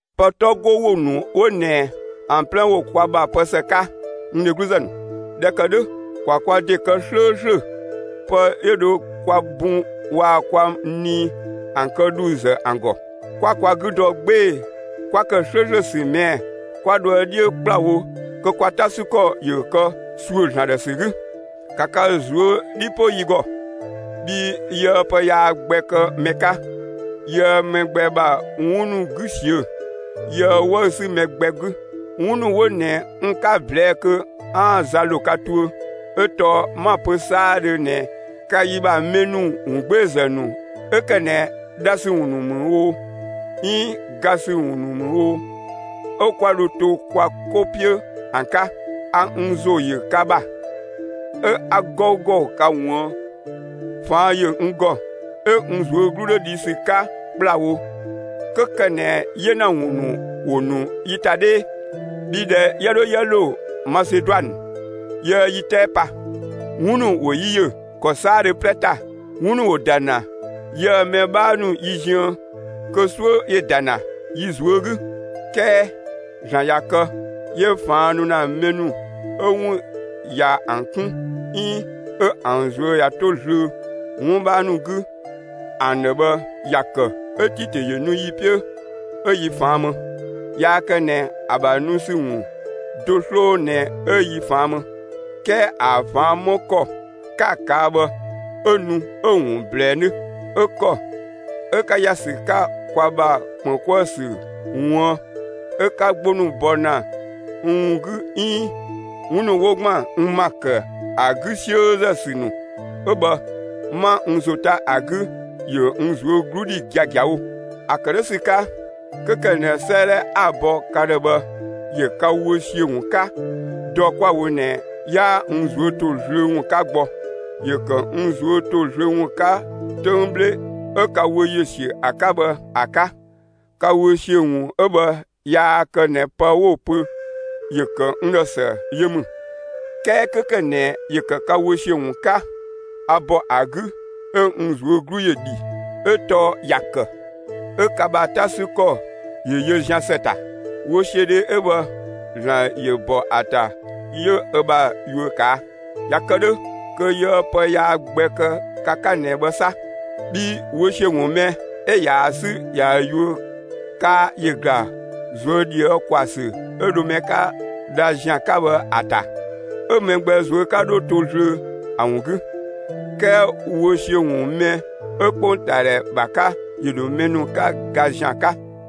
Pë 'tɔ 'go ‑wo ‑nu 'wo ꞊nɛ ‑an 'plɛ ‑wo kwa ‑bha pë ‑së 'ka, n dhegluzë ‑nu. ꞊Dhɛ ‑kë 'dhö, ‑kwa kwa ‑de kë 'slööslö pë 'yö dho kwa bun waa‑ kwa nii ‑an kë ‑dhuuzë ‑an ‑gɔ, 'kwa kwa 'gü dɔ 'gbee‑ 'kwa ‑kë 'slööslö ‑sü ꞊mɛɛ'‑ 'kwa dhoë 'dhiö ‑kplawo kö kwa 'ta 'sü ‑kɔ ‑yö ‑kë ‑suö ‑Zlan ‑dhë ‑sü 'gü. ‑Ka ka ꞊zuö' 'dhi 'po yi ‑gɔ! Bhii yiëë pë yaa gbɛ kë mɛ 'ka, yiëë mɛ gbɛ ‑bha 'wun ‑nu 'gü ꞊siö'‑; yiëë 'wëü‑ sü mɛ gbɛ 'gü. 'Wun ‑nu 'wo ꞊nɛ n 'ka‑ ꞊blɛɛ'‑ kö 'aan‑ za ‑lo ka tuö. 'Ö tɔɔ 'ma‑ pö 'saadhö ꞊nɛ ka yi ‑bha mɛ ‑nu ‑wungbeezë ‑nu 'ö ‑kë ꞊nɛ dha ‑sü ‑wun ‑nu ‑mü oo, 'iin ga ‑sü ‑wun ‑nu ‑mü oo, 'ö 'kwa dho to kwa 'ko 'piö ‑an 'ka. A n ‑zo ‑yö ka ‑bha, 'ö 'a 'gɔugɔ ka ꞊wuën'; ꞊faan' ‑yö n ‑gɔ, 'ö n ꞊zuö' 'glu 'dho dhi ‑sü 'ka ‑kplawo, 'kö ‑kë ꞊nɛ 'yena ‑wun ‑nu ‑wo ‑nu yi ‑ta 'dhee. Bhii ꞊dhɛ 'yië 'dho 'yië ‑lo Maseduanë, yiëë yi 'tɛɛ pa. 'Wun ‑nu ‑wo yi ‑yö ‑kɔ 'saadhö 'plɛ ‑ta; 'wun ‑nu ‑wo ‑da ‑na yië‑ mɛ 'bhaa ‑nu yi ziën kö 'suö ‑yö ‑da ‑na yi ꞊zuö' 'gü. 'Kɛɛ ‑Zlan ꞊ya kë 'yö ꞊faan' nu ‑na mɛ ‑nu 'ö 'wun ꞊ya ‑an kun 'iin 'ö ‑an ꞊zuö' ꞊ya 'to zlöö 'wun 'bhaa ‑nu 'gü ‑an ‑dhë bhë ‑ya kë 'ö Titö ‑yö nu yi 'piö 'ö yi ꞊faan' më. Yaa kë ꞊nɛ ‑a ‑bha nu ‑sü ‑wun do 'sloo ꞊nɛ 'ö yi ꞊faan' më; 'kɛɛ ‑a ꞊faan' 'më ‑kɔ 'ka‑ ꞊kaa' bhë 'ö nu 'ö‑ ‑wun ꞊blɛɛ 'nö, 'ö ‑kɔ 'ö 'ka ‑ya ‑sü 'ka kwa ‑bha ‑kpën 'kuë‑ ‑sü ꞊wuën', 'ö 'ka 'gbo ‑nu bɔ ‑na n ‑wun 'gü 'iin 'wun ‑nu 'wo ‑gban n ‑ma ‑kë ‑a 'gü 'siözë ‑sü ‑nu 'ö bhë, 'ma n ‑zo 'ta ‑a 'gü, ‑yö n ꞊zuö' 'glu dhi giagiawo. ‑A ‑kë 'dhö ‑sü 'ka, 'kö ‑kë ꞊nɛ 'sëëdhɛ 'a‑ bɔ ka ‑dhë bhë ‑yö ka wö ‑siö ‑wun 'ka, dɔ 'kwa‑ wo ꞊nɛ 'yaa n ꞊zuö' ‑to zlöö ‑wun 'ka gbɔ. ‑Yö ‑kë n ꞊zuö' ‑to zlöö ‑wun 'ka 'töng 'bhle 'ö ka wö ‑siö ‑a 'ka bhë ‑a 'ka. Ka wö ‑siö ‑wun 'ö bhë yaa kë ꞊nɛ pë 'wo‑ pö ‑yö ‑kë n ‑dhë ‑së yö ‑mü, 'kɛɛ 'kö ‑kë ꞊nɛ ‑yö ‑kë ka wö ‑siö ‑wun 'ka, a ‑bɔ ‑a 'gü 'ö n ꞊zuö' 'glu ‑yö ‑dhi 'ö tɔɔ ‑ya ‑kë 'ö ka ‑bha 'ta 'sü ‑kɔ ‑yö yö zian ‑së ‑ta. Wösiödhe 'ö bhë ‑Zlan ‑yö ‑bɔ ‑a ‑ta 'yö ö ‑bha yuö ꞊kaa'. ꞊Ya kë 'dhö kö yiëë pë yaa gbɛ kë ka 'ka ꞊nɛ bhë 'sa. Bhii wö ‑siö ‑wun mɛ 'ö ꞊yaa‑ 'sü ꞊ya yuö kaa ‑yö ‑gla ꞊zuö' ꞊dhië' ‑kwaa ‑sü 'ö dho mɛ 'ka dha ‑zian 'ka bhë ‑a ‑ta, 'ö mɛ gbɛ ꞊zuö' 'ka 'dho to zlöö ‑a ‑wun 'gü. 'Kɛɛ wö ‑siö ‑wun mɛ 'ö 'kpongtaadhɛ ‑bha 'ka, ‑yö ‑dho mɛ ‑nu 'ka ga ‑zian 'ka.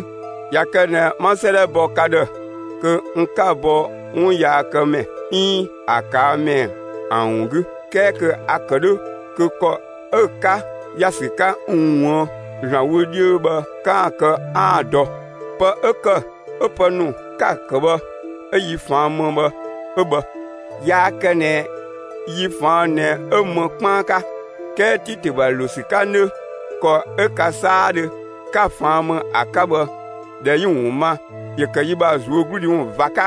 ꞊Ya kë ꞊nɛ 'ma 'sëëdhɛ bɔ ka ‑dhë kö n 'ka‑ bɔ 'wun yaakëmɛ 'iin ‑a ꞊kaa' ‑mɛ ‑an ‑wun 'gü, 'kɛɛ kö a‑ ‑kë 'dhö kö ‑kɔ 'ö 'ka ‑ya ‑sü 'ka n ꞊wuën' ‑Zlan wö 'dhiö bhë 'kaan‑ kë 'aan‑ dɔ. Pë 'ö ‑kë 'ö pë ‑nu 'ka‑ kë bhë 'ö yi ꞊faan' më bhë 'ö bhë; yaa kë ꞊nɛ yi ꞊faan' ꞊nɛ 'ö më 'kpaan 'ka; 'kɛɛ Titö ‑bha ‑lo ‑sü 'ka 'nö, ‑kɔ 'ö ka 'saadhö 'ka‑ ꞊faan' më ‑a 'ka bhë, ꞊dhɛ 'yi‑ ‑wun ma, ‑yö ‑kë yi ‑bha ꞊zuögludhi ‑wun ꞊va 'ka.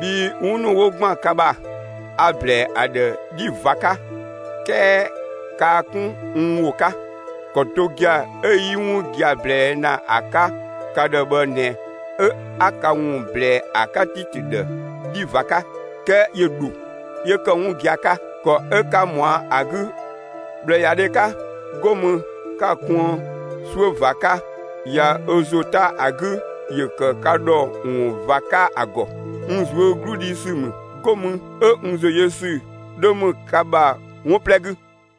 Bhii 'wun ‑nu 'wo ‑gban ka ‑bha, a‑ ‑blɛɛ ‑a ‑dhë 'dhi ꞊va 'ka 'kɛɛ kaa 'kun n ‑wo 'ka. ‑Kɔ do gia‑ 'ö 'yi 'wun gia‑ ꞊blɛɛ' ‑na ‑a 'ka ka ‑dhë bhë ꞊nɛ 'ö 'a ka ‑wun ꞊blɛɛ ‑a 'ka Titö ‑dhë 'dhi ꞊va 'ka; 'kɛɛ ‑yö ‑dho 'yö ‑kë 'wun gia‑ 'ka. ‑Kɔ 'ö 'ka ꞊mɔa' ‑a 'gü ꞊bhlëyadhe 'ka 'go mü 'ka‑ kuën 'suö ꞊va 'ka, ꞊ya ö ‑zo 'ta ‑a 'gü ‑yö ‑kë ka ‑dhɔ ‑wun ꞊va 'ka ‑a ‑gɔ. N ꞊zuö' 'glu dhi ‑sü ‑mü, 'go mü 'ö n ‑zo yö ‑sü 'dhö ‑mü ka ‑bha 'wun 'plɛ 'gü.